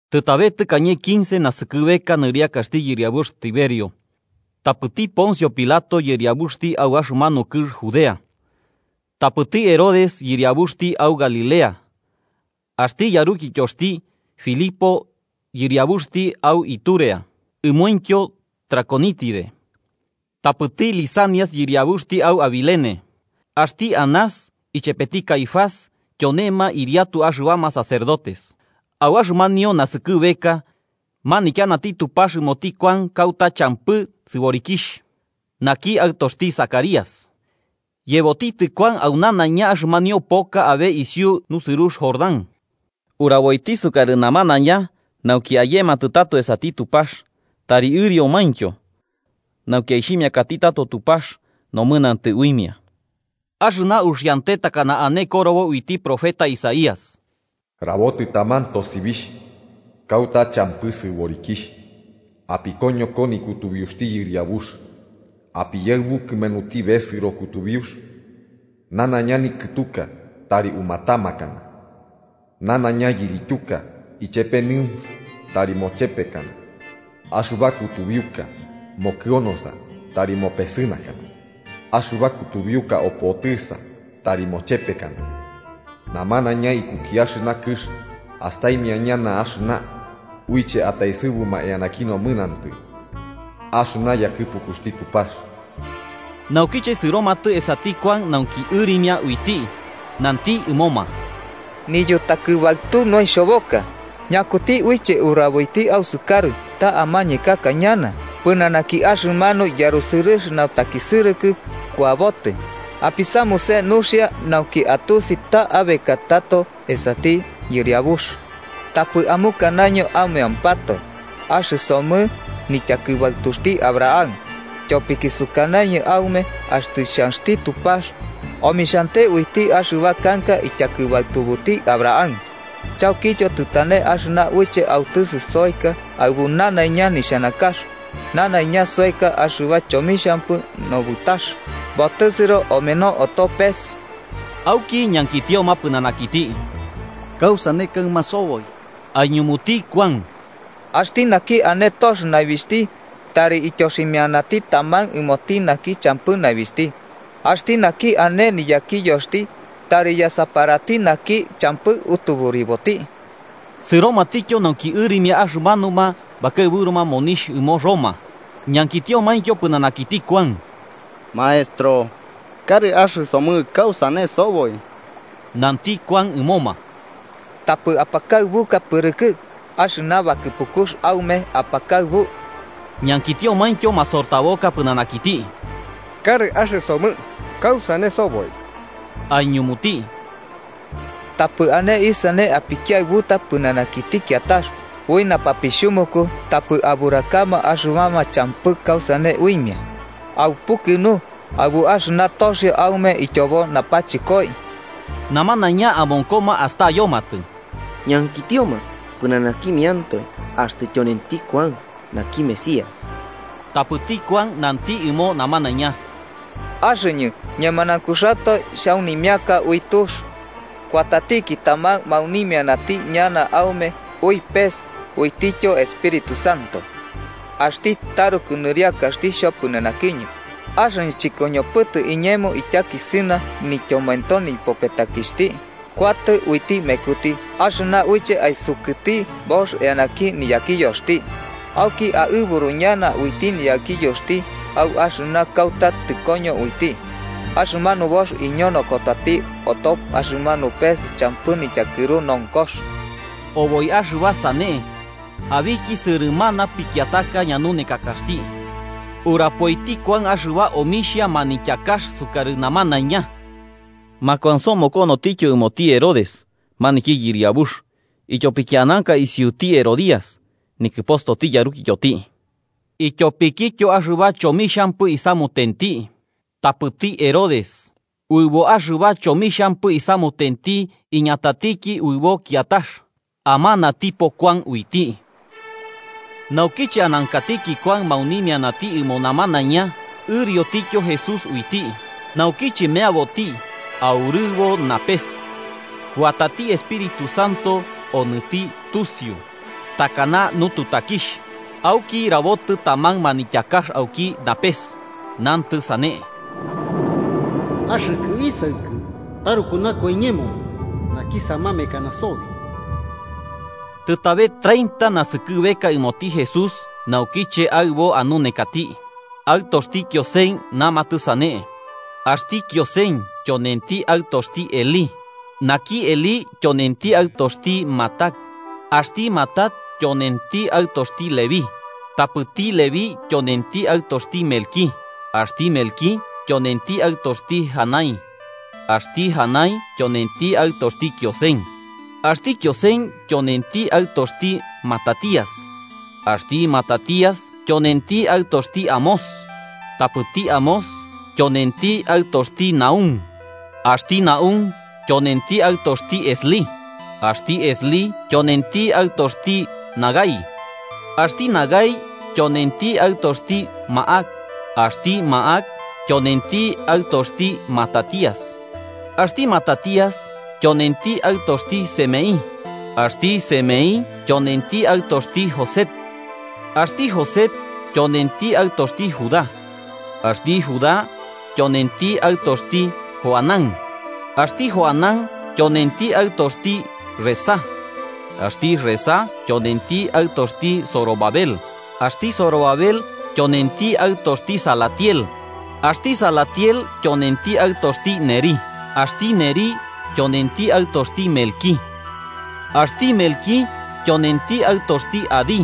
Tɨtabe tɨkañe quince naskɨbeka nɨriakaxti yɨriabux Tiberio, tapɨti Poncio Pilato yɨriabuxti au axɨmanu kɨx Judea. Tapɨti Herodes yɨriabuxti au Galilea, axti yarukityoxti, Filipo yɨriabuxti au Iturea ɨmointyo Traconítide, tapɨti Lisanias yɨriabuxti au Abilene. Axti Anás ichepeti Caifás tyonema ɨriatu axɨbama sacerdotes. Au axɨmanio naskɨbeka, manityanati Tupax ɨmoti Kuan kauta champɨ sɨborikixh, naki aɨtoxti Zacarías, yebotitɨ Kuan au nanaiña axɨmanio poka abe isiu nusɨrux Jordán, uraboiti isukarɨ namanaiña nauki ayematɨ tato esati Tupax tari ɨriomaintyo, nauki aixhimiakati tato Tupax nomɨnantɨ uimia. Axɨna uxiante takana ane korobo uiti profeta Isaías. “Rabotɨ taman tosibixh kauta champɨ sɨborikixh: ‘Apikoñoko nikutubiuxti Yɨriabux. Apiyaɨbu kɨmenuti besɨro kutubiux. Nanaiña nikɨtuka tari umatamakana, nanaiña yirityuka, ichepe nɨunx tari mochepekana, axɨba kutubiuka mokɨonosa tari mopesɨnakana, axɨba kutubiuka opotɨsa tari mochepekana. Namanaiña ikuki axɨna kɨx astaimia ñana axɨna uiche ataesɨbuma eanaki nomɨnantɨ axɨna yakɨpukuxti Tupax.’” Naukiche sɨromatɨ esati Kuan nauki ɨrimia uiti, nanti ɨmoma: “¡Niyutakɨbaɨtu noixhoboka! ¿Ñakuti uiche uraboiti ausukarɨ ta amañekaka ñana pɨnanaki axɨmanu yarusɨrɨx nautakisɨrɨkɨ kuabotɨ? Apisamuse nuxia nauki atusi ta abekatɨ tato esati Yɨriabux, tapɨ amukanaño aumeampatoe: ‘¡Axɨsomɨ nityakɨbaɨtuxti Abraham!’ Tyopiki sukanañɨ aume axtɨ xhanxti Tupax omixhante uiti axɨba kanka ityakɨbaɨtubuti Abraham. Chaukityo, tɨtane axɨna uiche autɨsɨ soeka aɨbu nanaiña niñuxanakax. Nanaiña soeka axɨba chomixhampɨ nobɨtakax, botɨsɨro omeno oto pes.” Auki ñankitioma pɨnanakiti: –¿Kausane kaɨma soboi? Aiñumuti Kuan: –Axti naki ane tox naibixhti, tari ityoximianati taman ɨmoti naki champɨ naibixhti. Axti naki ane niyakiyoxti, tari yasaparati naki champɨ utuburiboti. Sɨromatityo nauki ɨrimia axɨmanuma bakaɨburuma monixh ɨmo Roma, ñankitiomaintyo pɨnanakiti Kuan: –Maestro, ¿karɨ axɨsomɨ kausane soboi? Nanti Kuan ɨmoma: –Tapɨ apakaɨbuka pɨrɨkɨ axɨna bakɨpukux aume apakaɨbu. Ñankitiomaintyo masortaboka pɨnanakiti: –Karɨ axɨsomɨ, ¿kausane soboi? Aiñumuti: –Tapɨ ane isane apikiaɨbuta pɨnanakiti kiatax, ui napapixhumuku tapɨ aburakama axɨbama champɨ kausane uimia. Aupukɨnu aɨbu axɨna toxio aume ityobo napachɨkoi. Namanaiña amonkoma astayomatɨ, ñankitioma pɨnanakimiantoe axtɨ tyonenti Kuan naki Mesías. Tapɨti Kuan nanti ɨmo namanaiña: “Axɨñɨ, ñemanaunkuxatoe xhaunimiaka ui tux. Kuatatiki taman maunimianati ñana aume ui pes uitityo Espíritu Santo. Axti taruku nɨriakaxti xhopɨnanakiñɨ, axɨñɨ chɨkoñopɨtɨ iñemo ityakisɨna nityomoento nipopetakixhti. Kuatɨ uiti mekuti, axɨna uiche aisukɨti box eanaki niyakiyoxti. Auki aɨburu ñana uiti niyakiyoxti au axɨna kauta tɨkoño uiti, axɨmanu box iñonokotati oto axɨmanu pes champɨ nityakɨru nonkox.” Oboi axɨba sane, abiki sɨrɨmana pikiataka ñanunekakaxti, urapoiti Kuan axɨba omixhia manityakax sukarɨ namanaiña. Makuansomokonotityo ɨmoti Herodes, maniki yɨriabux, ityopiki ananka isiuti Herodías, nikɨpostoti yarukityoti, ityopikityo axɨba chomixhampɨ isamutenti. Tapɨti Herodes, uɨbo axɨba chomixhampɨ isamutenti iñatatiki uɨbo kiatax: amanatipo Kuan uiti. Naukiche anankatiki Kuan maunimianati ɨmo namanaiña, ɨriotityo Jesús uiti. Naukiche meaboti, aurɨbo napes kuatati Espíritu Santo onɨti tusiu, takana nututakixh, auki rabotɨ taman manityakax auki napes, nantɨ sane: –Axɨkɨ isaɨkɨ taruku nakua iñemo, naki samamekana sobi. Tɨtabe treinta naskɨbeka ɨmoti Jesús, naukiche aɨbo anunekati. Aɨtoxti Kiosen, namatɨ sane. Axti Kiosen, tyonenti aɨtoxti Elí, naki Elí tyonenti aɨtoxti Matat, axti Matat tyonenti aɨtoxti Leví, tapɨti Leví tyonenti aɨtoxti Melquí, axti Melquí, tyonenti aɨtoxti Janai, axti Janai tyonenti aɨtoxti Kiosen, axti Kiosen tyonenti aɨtoxti Matatías, axti Matatías tyonenti aɨtoxti Amós, tapɨti Amós tyonenti aɨtoxti Nahúm, axti Nahúm tyonenti aɨtoxti Eslí, axti Eslí tyonenti aɨtoxti Nagai, axti Nagai tyonenti aɨtoxti Máhat, axti Máhat tyonenti aɨtoxti Matatías, axti Matatías tyonenti aɨtoxti Semeí, axti Semeí tyonenti aɨtoxti Josec, axti Josec tyoenti aɨtoxti Judá, axti Judá tyonenti aɨtoxti Johanán, axti Johanán tyonenti aɨtoxti Resá, axti Resá tyonenti aɨtoxti Zorobabel, axti Zorobabel tyonenti aɨtoxti Salatiel, axti Salatiel tyonenti aɨtoxti Nerí, axti Nerí tyonenti aɨtoxti Melquí, axti Melquí tyonenti aɨtoxti Adí,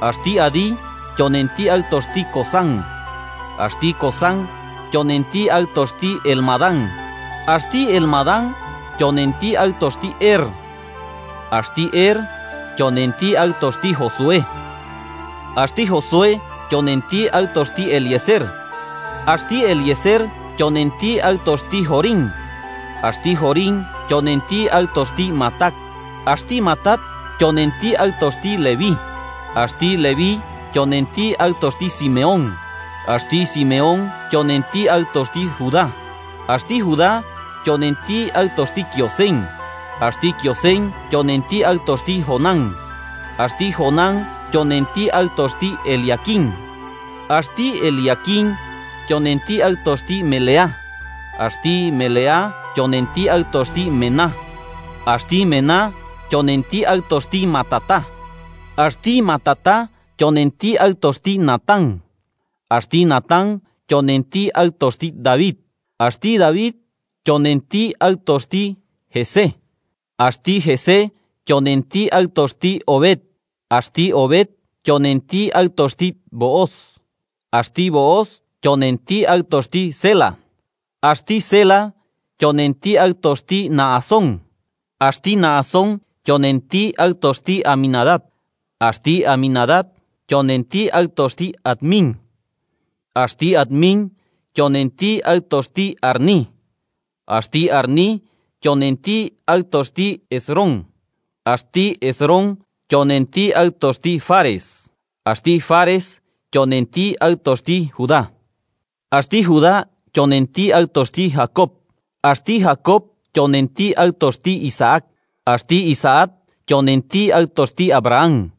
axti Adí tyonenti aɨtoxti Cosam, axti Cosam tyonenti aɨtoxti Elmadam, axti Elmadam tyonenti aɨtoxti Er, axti Er tyonenti aɨtoxti Josué, axti Josué tyonenti aɨtoxti Eliézer, axti Eliézer tyonenti aɨtoxti Jorim, axti Jorim tyonenti aɨtoxti Matat, axti Matat tyonenti aɨtoxti Leví, axti Leví tyonenti aɨtoxti Simeón, axti Simeón tyonenti aɨtoxti Judá, axti Judá tyonenti aɨtoxti Kiosen, axti Kiosen tyonenti aɨtoxti Jonam, axti Jonam tyonenti aɨtoxti Eliaquim, axti Eliaquim tyonenti aɨtoxti Meleá, axti Meleá tyonenti aɨtoxti Mená, axti Mená tyonenti aɨtoxti Matatá, axti Matatá tyonenti aɨtoxti Natán, axti Natán tyonenti aɨtoxti David, axti David tyonenti aɨtoxti Jesé, axti Jesé tyonenti aɨtoxti Obed, axti Obed tyonenti aɨtoxti Booz, axti Booz tyonenti aɨtoxti Sélah, axti Sélah tyonenti aɨtoxti Nahasón, axti Nahasón tyonenti aɨtoxti Aminadab, axti Aminadab tyonenti aɨtoxti Admín, axti Admín tyonenti aɨtoxti Arní, axti Arní tyonenti aɨtoxti Hesrón, axti Hesrón tyonenti aɨtoxti Fares, axti Fares tyonenti aɨtoxti Judá, axti Judá tyonenti aɨtoxti Jacob, axti Jacob tyonenti aɨtoxti Isaac, axti Isaac tyonenti aɨtoxti Abraham,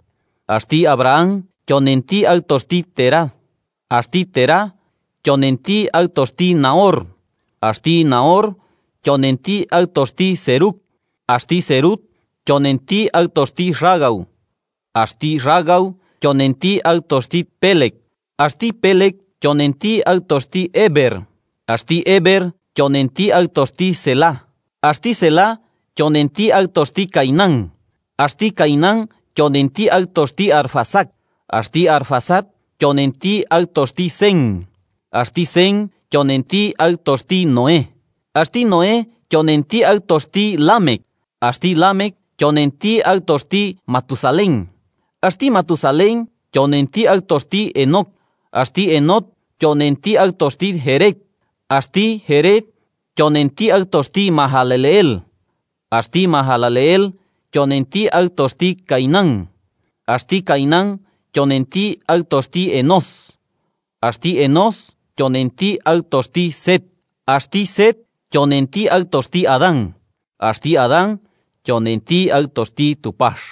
axti Abraham tyonenti aɨtoxti Térah, axti Térah tyonenti aɨtoxti Nahor, axti Nahor tyonenti aɨtoxti Serug, axti Serug tyonenti aɨtoxti Ragau, axti Ragau tyonenti aɨtoxti Péleg, axti Péleg tyonenti aɨtoxti Éber, axti Éber tyonenti aɨtoxti Sélah, axti Sélah tyonenti aɨtoxti Cainán, axti Cainán tyonenti aɨtoxti Arfaxad, axti Arfaxad tyonenti aɨtoxti Sem, axti Sem tyonenti aɨtoxti Noé, axti Noé tyonenti aɨtoxti Lámec, axti Lámec tyonenti aɨtoxti Matusalén, axti Matusalén tyonenti aɨtoxti Henoc, axti Henoc tyonenti aɨtoxti Jéred, axti Jéred tyonenti aɨtoxti Mahalaleel, axti Mahalaleel tyonenti aɨtoxti Cainán, axti Cainán tyonenti aɨtoxti Enós, axti Enós tyonenti aɨtoxti Set, axti Set tyonenti aɨtoxti Adán, axti Adán tyonenti aɨtoxti Tupax.